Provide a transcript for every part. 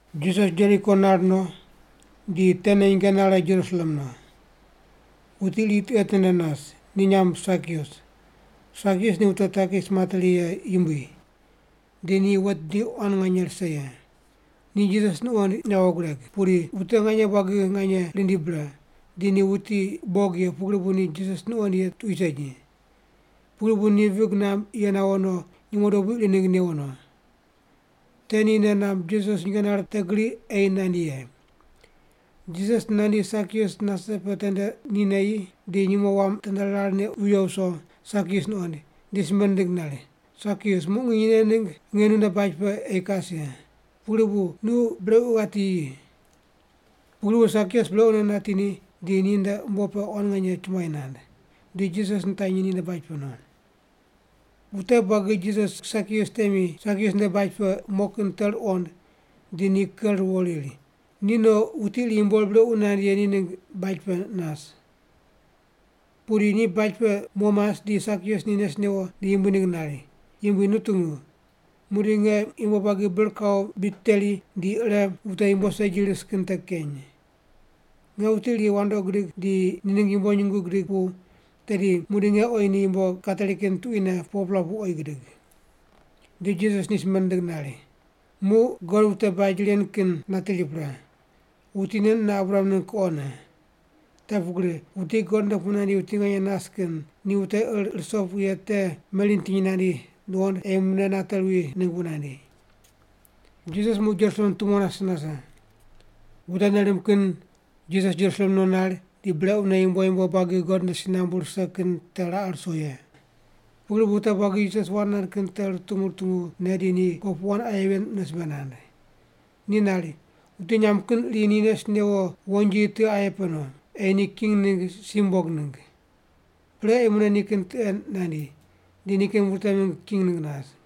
Jisas Jeriko nar no di tene nyinge nare Jerusalem no. Wuti iri tiqe tende nas, ni nyamb Sakius. Sakius ni wute takis materi ye yumbui, di ni wet bidi quan nganye rise ye. Ni Jisas nuqoind yawo gureg, pudi wute nganye buagi nganye rindi bre, di ni wuti bog ye pugri bu ni Jisas nuqoind ye tuqui segi. Pugri bu ni vig namb ye nawo no, nyumo dobui iri ningg newo no. Te ni nei namb Jisas nyinge nare te gri ei nandi ye. Jisas nandi Sakius nase pe tende ni neyi di nyumo wam tende rar neq wiyo wuso, Sakius nuqoind, di simbe nindig nari, “Sakius, muq nginy nen ningg nge nunde baj pe ei kas ye. Pugri bu nu brequ ghati yi.” Pugri bu Sakius brequne nati ni, di ni nde umbo pe quan nganye chumbuai nand, di Jisas nitanyi ninde baj pe no. Wute buagi Jisas Sakius temi Sakius nde baj pe mo kin te ruqond di ni ker ruwo riri, “Ni no wuti iri yumbo ur brequ nand ye ni ningg baj pe nas.” Pudi ni baj pe mo mas di Sakius ni nes newo di Yumbui ningg nari, “Yumbui, nu tungu. Muqdi nge yumbo buagi bir kawo bid teri di ire wute yumbo segi ris kin te keny. Nge wuti iri wandoqi gidig di ni ningg yumbo nyungu gidig pu tedi muqdi nge oyi ni yumbo kateri kin tuquine 4-pela pu oyi gidig.” Di Jisas ni simbe nindig nari, “Muq God wute baj ren kin nateri pre. Wuti nen mune Abraham ningg kuqone. Te pugri wuti God nde pu nandi wuti nganye nas kin ni wute ir ruso ye te meri nitiny nandi nuqond ei mune nate ruwi ningg bu nandi.” Jisas muq Jerusalem tumo nase nase. Wute nei rimb kin Jisas Jerusalem no nar di brequne yumbo yumbo buagi God nde si nambu rise kin te raqe ruso ye. Pugri bu wute buagi Jisas wand nand kin te rutungu rutungu ne di ni kopuqu wand aye ven mune simbe nand. Ni nari, “Wuti nyamb kin iri ni nes newo wonji tiqe aye pe no, ei ni king ningg si mumbog ningg. Pre ei mune nikin tiqe nandi, di nikin wute mingg king ningg nas.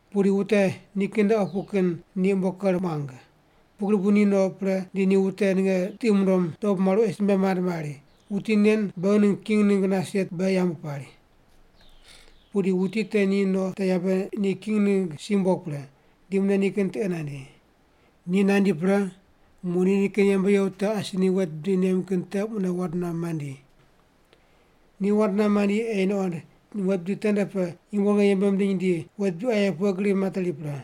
“Pudi wute nikin nde opu kin ni umbo ker muang, pugri bu ni no pre di ni wute ninge tiqi mundom dobu maru ei simbe mand mari, ‘Wuti nen beghi ningg king ningg nas ye beghi yambu pari.’ “Pudi wuti te ni no te yabe ni king ningg si mumbog pre, di mune nikin tiqe nandi. Ni nandi pre, muq ni nikin yembe ye wute asi ni wet bidi nem kin te mune wand nuam mandi. Ni wand nuam mandi ei nuqond ni wet bidi tende pe yumbo ninge yembe mindiny di wet bidi aye pughe gri materi pre.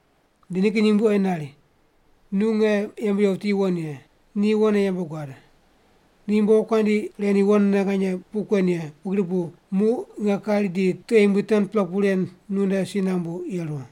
“Di nikin yumbui oyi nari, ‘Nu nge yembe ye wuti yuwon ye. Nu yuwonne yembe guad. Nu yumbo wokuandi ren yuwonne nganye puq kuen ye, pugri bu muq nge kari di tiqe yumbui 10-pela pu ren nunde si nambu yeru.’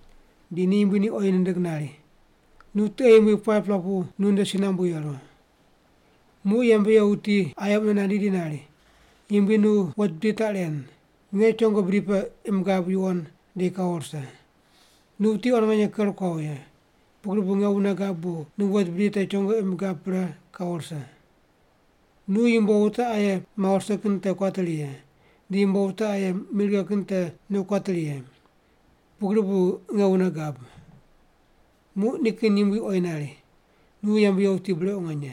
“Di ni yumbui ni oyi nindig nari, ‘Nu tiqe yumbui 5-pela pu nu nde si nambu yeru.’ “Muq yembe ye wuti aye mune nandi di nari, ‘Yumbui, nu wet bidi taq ren. Nge chongo bidi pe imb gab yuwon, di kawo rise. Nu wuti quan nganye ker kuawo ye, pugri bu nge wune gab bu nu wet bidi te chongo imb gab pre kawo rise. Nu yumbo wute aye mawo rise kin te kuateri ye, di yumbo wute aye mi righe kin te nu kuateri ye. Pugri bu nge wune gab.’ “Muq nikin yumbui oyi nari, ‘Nu yembe ye wuti brequ nganye.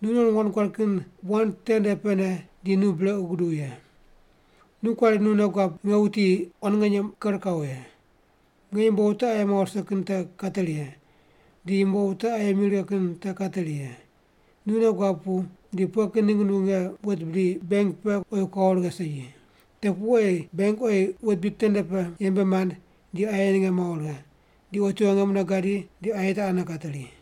Nu non wand guad kin wand tende pene di nu brequ guduw ye. Nu kuari nu nei guab nge wuti quan nganye ker kawo ye, nge yumbo wute aye mawo rise kin te kateri ye, di yumbo wute aye mi righe kin te kateri ye. Nu nei guab pu di pughe kin ningg nu nge wet bidi benk pe oyi kuawo righe segi? Te pu ei benk oyi wet bidi tende pe yembe mand di aye ninge mawo righe, di otiwo nge mune gadi di aye te ane kateri.’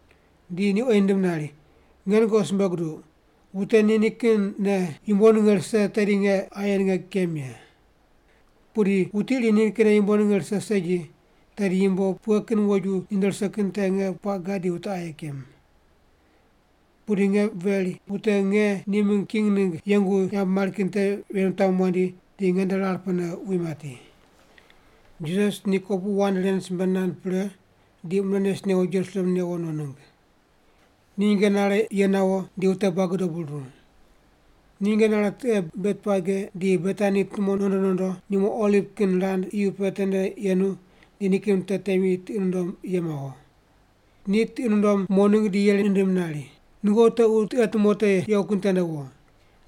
“Di ni oyi nindim nari, ‘Nge nungoqi simbe guduq, wute nikinne yumbo ninge rise tedi nge aye ninge kem ye. Pudi wuti iri nikinne yumbo ninge rise segi, tedi yumbo pughe kin woju ni nde rise kin te nge puaq gad di wute aye kem. Pudi nge veri, wute nge ni mingg king ningg yengu yambu mari kin te ven wutami wandi di nge nde rar pene wi mati’.” Jisas ni kopuqu wand ren simbe nand pre di mune nes newo Jerusalem newo no ningg. Ni nyinge nare ye nawo di wute buagi dobu ruru. Ni nyinge nare tiqe Betpage di Betani tumo nondo nondo, nyumo oliv kin rand iyu pe tende yenu di nikin wute temi tiqi nundom ye mawo. Ni tiqi nundom mo ningg di yeri nindim nari, “Nungoqi tequ tiqe tumo te yequ kin tende wo.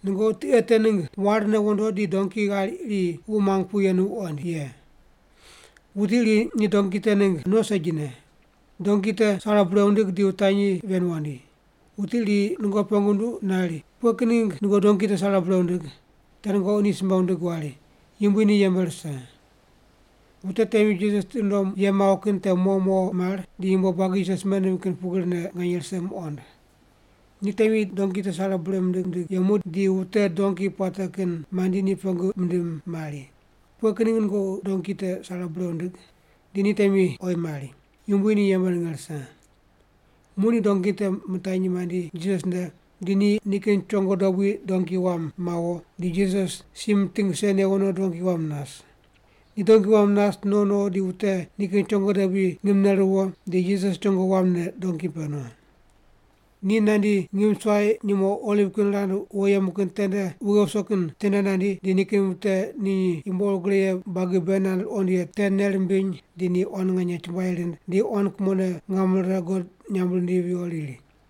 Nungoqi tiqe te ningg warne wondo di donki ghair iri wuq muang pu yenu wuqoind ye. Wuti iri ni donki te ningg no segine. Donki te sare bure wundig di wutanyi ven wandi. Wuti iri nungoqi pengu nunduq nari, ‘Pughe kin ningg nungoqi donki te sare bure wundig?’ Te nungoqi ni simbe wundig wari, ‘Yumbui ni yembe rise’.” Wute temi Jisas tiqi nundom ye mawo kin te mo mo mar di yumbo buagi Jisas simbe nindim kin pugrine nganye rise muqond. Ni temi donki te sare bure mindig mindig yemu di wute donki puate kin mandi ni pengu mindim mari, “Pughe kin ningg nungoqi donki te sare bure wundig?” Di ni temi oyi mari, “Yumbui ni yembe ninge rise.” Muq ni donki te mitanyi mandi Jisas nde di ni nikin chongo dobui donki wam mawo, di Jisas si miting rise newo no donki wam nas. Ni donki wam nas no no di wute nikin chongo dobui ngimne ruwo di Jisas chongo wamne donki pe no. Ni nandi ngim suai nyumo oliv kin rand wo yemu kin tende wughe wuso kin tende nandi, di nikin wute ni yumbo ur gre ye buagi bei nand ruqond ye te nei rimbiny di ni quan nganye chumbuai rind di quan kumone ngam rire God nyamb rindivi viyo riri,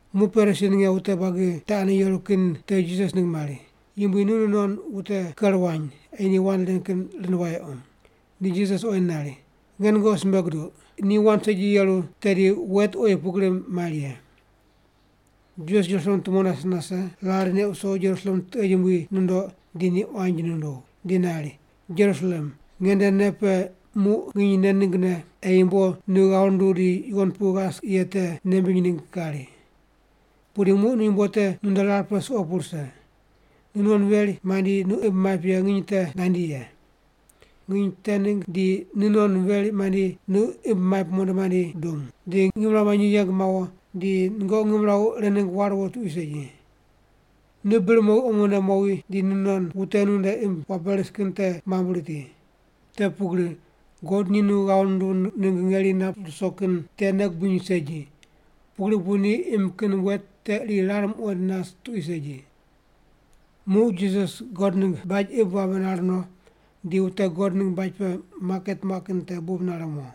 Muq Parisi ninge wute buagi te ane yeru kin te Jisas ningg mari, “Yumbui, nu nu non wute ker wany, ei ni wand ren kin rind wayequ.” Di Jisas oyi nari, “Nge nungoqi simbe guduq. Ni wand segi yeru, tedi wet oyi pugri mari ye.” Jisas Jerusalem tumo nase nase rar neq wuso Jerusalem tiqe yumbui nundoq di ni quanji nunduw, di nari, “Jerusalem, nge nde nei pe muq nginy nen ninggne ei yumbo nu ghav runduw di yuwon pu ghas ye te nei mbiny ningg kari. Pudi muq yumbo te nu nde rar pe suqo pu rise. Nu non veri mandi nu imb maip ye nginy te nandi ye. Nginy te ningg di nu non veri mandi nu imb maip mondo mandi dung, di ngimrawu manyi yeng mawo, di nungoqi ngimrawu ire ningg war wo tuqui segi. Nu bir mowi omone mowi di nu non wute nu nde imb wabe ris kin te mambui riti. Te pugri God ni nu ghav nunduw ningg ngeri ren nap ruso kin te nei gubiny segi, pugri bu ni imb kin wet te iri rar muqoind nas tuqui segi.” Muq Jisas God ningg baj imb wabe nar no, di wute God ningg baj pe maket muaq kin te bub nare mo.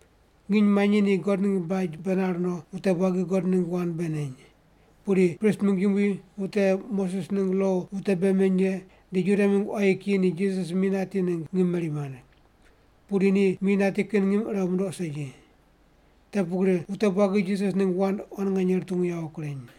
Nginy manyi ni God ningg baj pe nar no wute buagi God ningg wand bei neny. Pudi prist mingg yumbui, wute Moses ningg lo wute bei meny ye di Juda mingg quayi kiyi ni Jisas mi nati ningg ngim meri mand. Pudi ni mi nati kin ngim ire mundoq segi. Te pugri wute buagi Jisas ningg wand quan nganye rutungu yawo kureny.